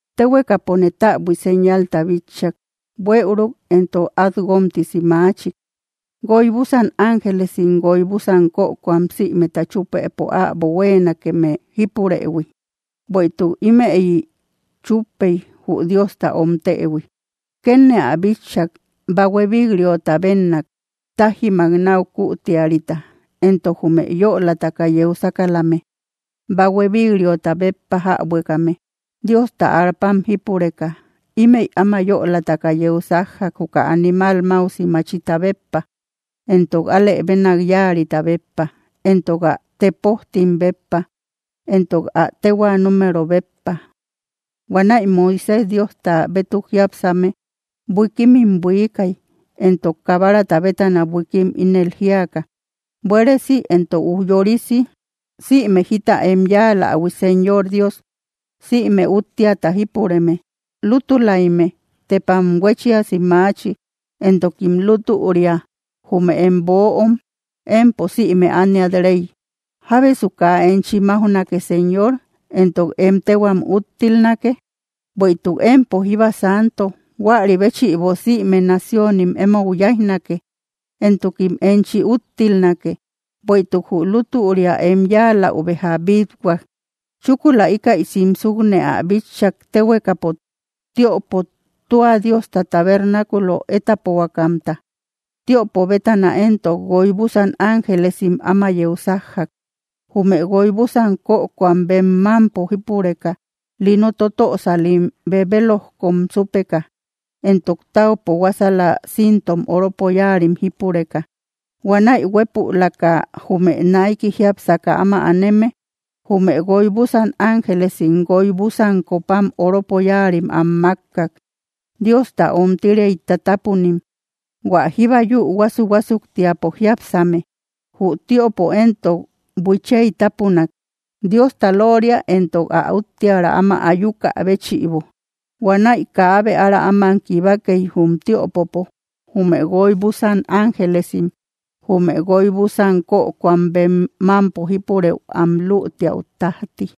Téhuekapone täbui señalta bitchak, buëuruk entok at guomtisi maachik: Guoy búsan ángelesim guoy búsan kökoam sïmeta chúpëpo äbo huéenakeme jípurëhui. Bueïtuk ímëyi chúppey, jü Diosta omtëhui. Kétne ä bitchak, bahue vik‑riota bénnak, tájimak náu kütiarita, entok jume yölataka yeu sákalame, bahue vik‑riota béppa jäbuekame, Diosta arpam jípureka. Ímëi áma yölataka yeu sájjak, juka animal máusi machita béppa, entok alë bénak yáarita béppa, entok ä tepojtim béppa, entok ä téhua número béppa. Huanäi Moisés Diosta bétuk jiápsame buikimim buiikay, entok Kabarata bétana buiikim, ínel jíaka: Buéresi entok ujyoori sïme jita em yáalähui, Señor Dios, sïme Útteata jípureme. Lútulaimme, tepam huéchiasi maachi, entokim lútüria, jume em böom, empo sïme ániat Rey. ¿Jábesu kaa enchi máujnake, Señor, entok em téhuam úttilnake? Bueïtuk empo jíba santo; huari béchïbo, sïme naciónim, emou yáijnake, entokim enchi úttilnake, bueïtuk jü lútüria em yáaläu béja bít‑huak. Chúkula íkäi simsukne ä bitchak, téhuekapo tiöpo tua Diosta tabernaculo étapohuakamta. Tiöpo bétana éntok, guoy búsan ángelesim áma yeu sájjak, jume guoy búsan kökoam bem mámpo jípureka, lino totösalim bebelojkom súpeka, entok táupo huásala cíntom oropo yáarim jípureka. Huanäi huépülaka jume naiki jiápsaka áma aneme jume guoy búsan ángelesim guoy búsan copam oropo yáarim am mákkak, Diosta ómtiriay tátapunim, hua jíba yü huásu‑huásuktiapo jiápsame. Jü tiöpo éntok buiichiay tápunak, Diosta lóoria entok ä úttiära áma ayukä béchïbo. Huanäi kaabe ára áman kibakey, jum tiöpopo, jume guoy búsan ángelesim jume guoy búsan kökoam bem mámpo jípurëu am lütiau tájti.